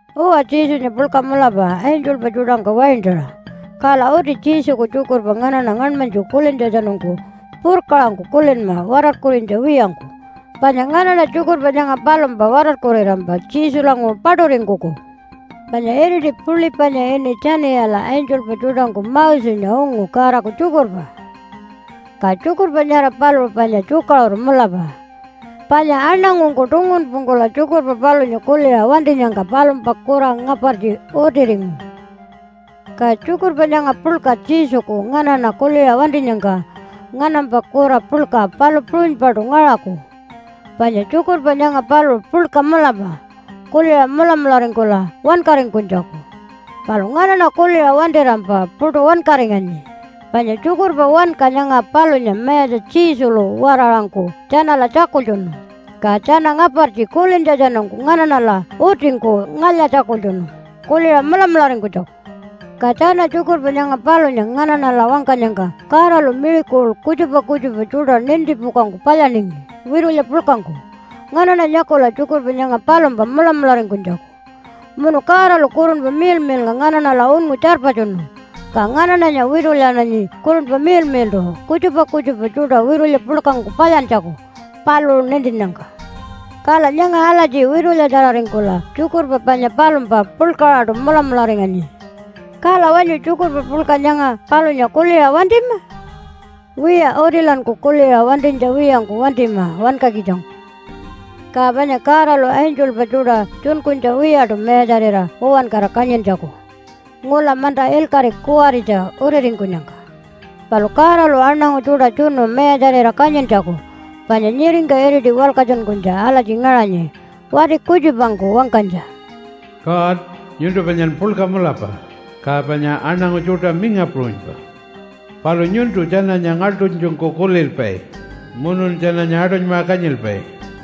Uwa, Jesunya puḻka mulapa angelpa tjuṯangka waintaṟa, kala uti Jesuku tjukurpa nganaṉa ngaṉmanytju kulintjatjanungku purkaṟangku kulinma watarkurinytja wiyangku. Panya nganaṉa tjukurpa nyanga palumpa watarkurirampa Jesulanguṟu paṯuringkuku. Panya iriti puḻi panya ini Tjaniyala angelpa tjuṯangku Mosenya ungu Godaku tjukurpa. Ka tjukurpa nyara paluṟu panya tjukaṟuru mulapa, panya aṉangungku tungunpungkula tjukurpa palunya kuliṟa wantinyangka palumpa kura ngapartji utiringu. Ka tjukurpa nyanga puḻka Jesuku nganaṉa kuliṟa wantinyangka nganampa kura puḻka palu puṟunypaṯu ngaṟaku, panya tjukurpa nyanga paluṟu puḻka mulapa kuliṟa mulamularingkula wankaringkunytjaku. Palu nganaṉa kuliṟa wantirampa puṯu wankaringanyi. Panya tjukurpa wanka nyanga palunya Mayatja Jesulu-waraṟangku tjanala tjakultjunu, ka tjana ngapartji kulintjatjanungku nganaṉala utingku ngalya-tjakultjunu kuliṟa mulamularingkunytjaku. Ka tjana tjukurpa nyanga palunya nganaṉala wangkanyangka Godalu miracle kutjupa kutjupa tjuṯa nintipukangku palyaningi witulya puḻkangku, nganaṉa nyakula tjukurpa nyanga palumpa mulamularingkunytjaku. Munu Godalu Kurunpa Miḻmiḻnga nganaṉala unngu tjarpatjunu, ka nganaṉanya witulyananyi Kurunpa Miḻmiḻṯu kutjupa kutjupa tjuṯa witulya puḻkangku palyantjaku paluṟu nintinnyangka. Kala nyanga alatji witulyatjararingkula tjukurpa panya palumpa puḻkaṟaṯu mulamularinganyi. Kala wanyu tjukurpa puḻka nyanga palunya kuliṟa wantima? Wiya, utilanku kuliṟa wantinytja wiyangku wantima wankakitjangku. Ka panya Godalu angelpa tjuṯa tjunkunytja wiyaṯu mayatjarira uwankara kanyintjaku ngula manta ilkaṟi kuwaritja utiringkunyangka. Palu Godalu aṉangu tjuṯa tjunu mayatjarira kanyintjaku, panya nyiringka iriti walkatjunkunytja alatji ngaṟanyi wati kutjupangku wangkanytja, “God, nyuntu panyan puḻka mulapa, ka panya aṉangu tjuṯa minga puṟunypa. Palu nyuntu tjananya ngaḻṯunytjungku kulilpai, Munun tjananya aṯunymaṟa kanyilpai.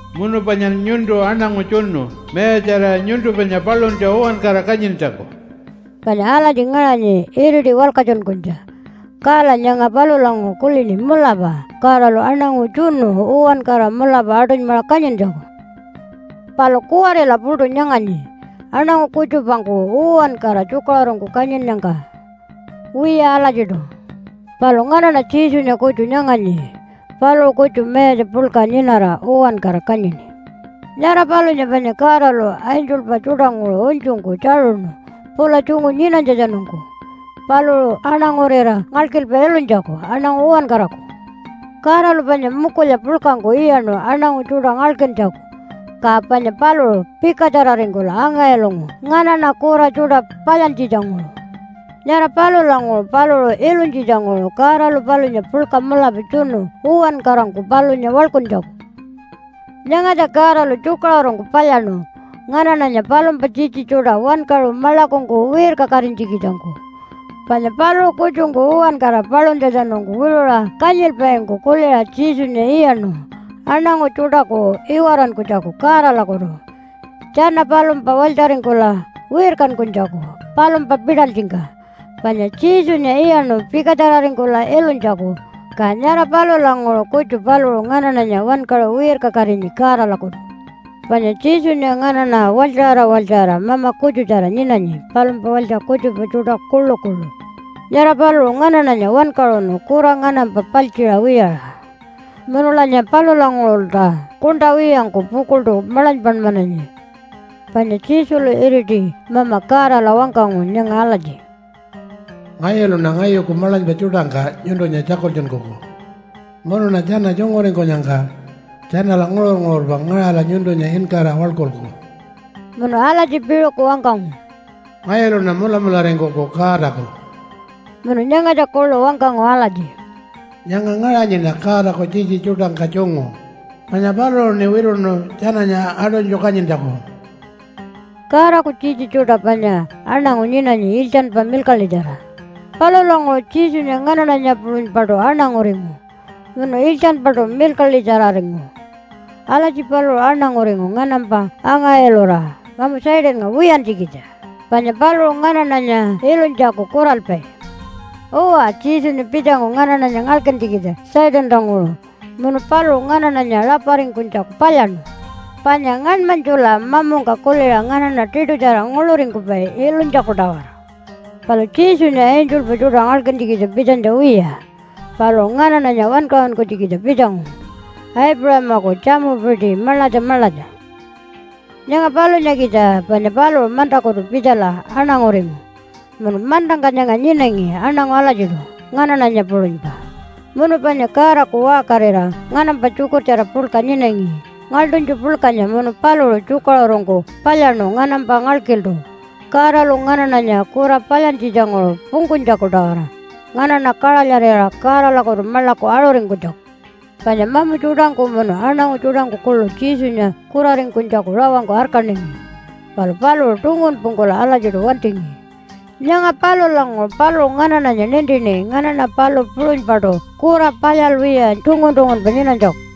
Munu panyan nyuntu aṉangu tjunu mayatjarira nyuntu panya paluntja uwankara kanyintjaku.” Panya alatji ngaṟanyi iriti walkatjunkunytja, kala nyanga palulanguṟu kulini mulapa Godalu aṉangu tjunu uwankara mulapa aṯunymaṟa kanyintjaku. Palu kuwarila puṯu nyanganyi aṉangu kutjupangku uwankara tjukaṟurungku kanyinnyangka. Wiya alatjiṯu. Palu nganaṉa Jesunya kutju nyanganyi. Paluṟu kutju mayatja puḻka nyinara uwankara kanyini. Nyara palunya panya Godalu angelpa tjuṯanguṟu unytjungku tjaṟuṉu pula tjungu nyinanytjatjanungku paluṟu aṉangurira ngalkilpa ilunytjaku aṉangu uwankaraku. Godalu panya mukulya puḻkangku iyaṉu aṉangu tjuṯa ngalkintjaku, ka panya paluṟu pikatjararingkula anga-ilungu nganaṉa kura tjuṯa palyantjitjanguṟu. Nyara palulanguṟu paluṟu ilunytjitjanguṟu Godalu palunya puḻka mulapa tjunu uwankarangku palunya waḻkuntjaku. Nyangatja Godalu tjukaṟurungku palyaṉu nganaṉanya palumpa tjitji tjuṯa wankaṟu maḻakungku wirkakatinytjikitjangku. Panya paluṟu kutjungku uwankara paluntjatjanungku wiṟuṟa kanyilpaingku kuliṟa Jesunya iyaṉu aṉangu tjuṯaku iwarankunytjaku Godalakutu, tjana palumpa walytjaringkula wirkankunytjaku palumpa pitalytjingka. Panya Jesunya iyaṉu pikatjararingkula ilunytjaku, ka nyara palulanguṟu kutju paluṟu nganaṉanya wankaṟu wirkakatinyi Godalakutu. Panya Jesunya nganaṉa walytjaṟara walytjaṟara Mama kutjutjara nyinanyi palumpa walytja kutjupa tjuṯa kuḻukuḻu. Nyara paluṟu nganaṉanya wankaṟunu kura nganampa paltjiṟa wiyaṟa, munulanya palulanguṟulta kuṉṯa wiyangku pukuḻṯu maḻanypanmananyi. Panya Jesulu iriti Mama Godala wangkangu nyanga alatji, “Ngayuluṉa ngayuku maḻanypa tjuṯangka nyuntunya tjakultjunkuku. Munuṉa tjana tjunguringkunyangka tjanala nguṟur-nguṟurpa ngaṟala nyuntunya inkara waḻkulku.” Munu alatji piṟuku wangkangu, “Ngayuluṉa mulamularingkuku Godaku.” Munu nyangatja kuḻu wangkangu alatji, “Nyanga ngaṟanyiṉa Godaku tjitji tjuṯangka tjungu, panya paluṟuṉi wituṉu tjananya aṯunytju kanyintjaku.” Godaku tjitji tjuṯa panya aṉangu nyinanyi iltjanpa milkaḻitjara. Palulanguṟu Jesunya nganaṉanya puṟunypaṯu aṉanguringu munu iltjanpaṯu milkaḻitjararingu. Alatji paluṟu aṉanguringu nganampa anga-ilura mamu Satannga wiyantjikitja, panya paluṟu nganaṉanya ilunytjaku kuralpai. Uwa, Jesunya pitjangu nganaṉanya ngalkintjikitja Satantanguṟu munu paluṟu nganaṉanya raparingkunytjaku palyaṉu. Panya ngaṉmanytjula mamungka kuliṟa nganaṉa tiṯutjara nguḻuringkupai ilunytjaku-tawara. Palu Jesunya angelpa tjuṯa ngalkintjikitja pitjanytja wiya. Paluṟu nganaṉanya wankaṟunkunytjikitja pitjangu Aipuṟamaku tjamupiti maḻatja maḻatja. Nyanga palunyakitja panya paluṟu mantakutu pitjala aṉanguringu munu mantangka nyanga nyinangi aṉangu alatjiṯu nganaṉanya puṟunypa. Munu panya Godaku waṟkarira nganampa tjukurtjara puḻka nyinangi ngaḻṯunytju puḻkanya munu paluṟu tjukaṟurungku palyaṉu nganampa ngalkiltu Godalu nganaṉanya kura palyantjitjanguṟu pungkunytjaku-tawara nganaṉa kaṟalyarira Godalakutu maḻaku aṟuringkunytjaku. Panya mamu tjuṯangku munu aṉangu tjuṯangku kuḻu Jesunya kuraringkunytjaku rawangku arkaningi, palu paluṟu tungunpungkula alatjiṯu wantingi. Nyanga palulanguṟu paluṟu nganaṉanya nintini nganaṉa palu puṟunypaṯu kura palyalwiya tungun-tungunpa nyinanytjaku.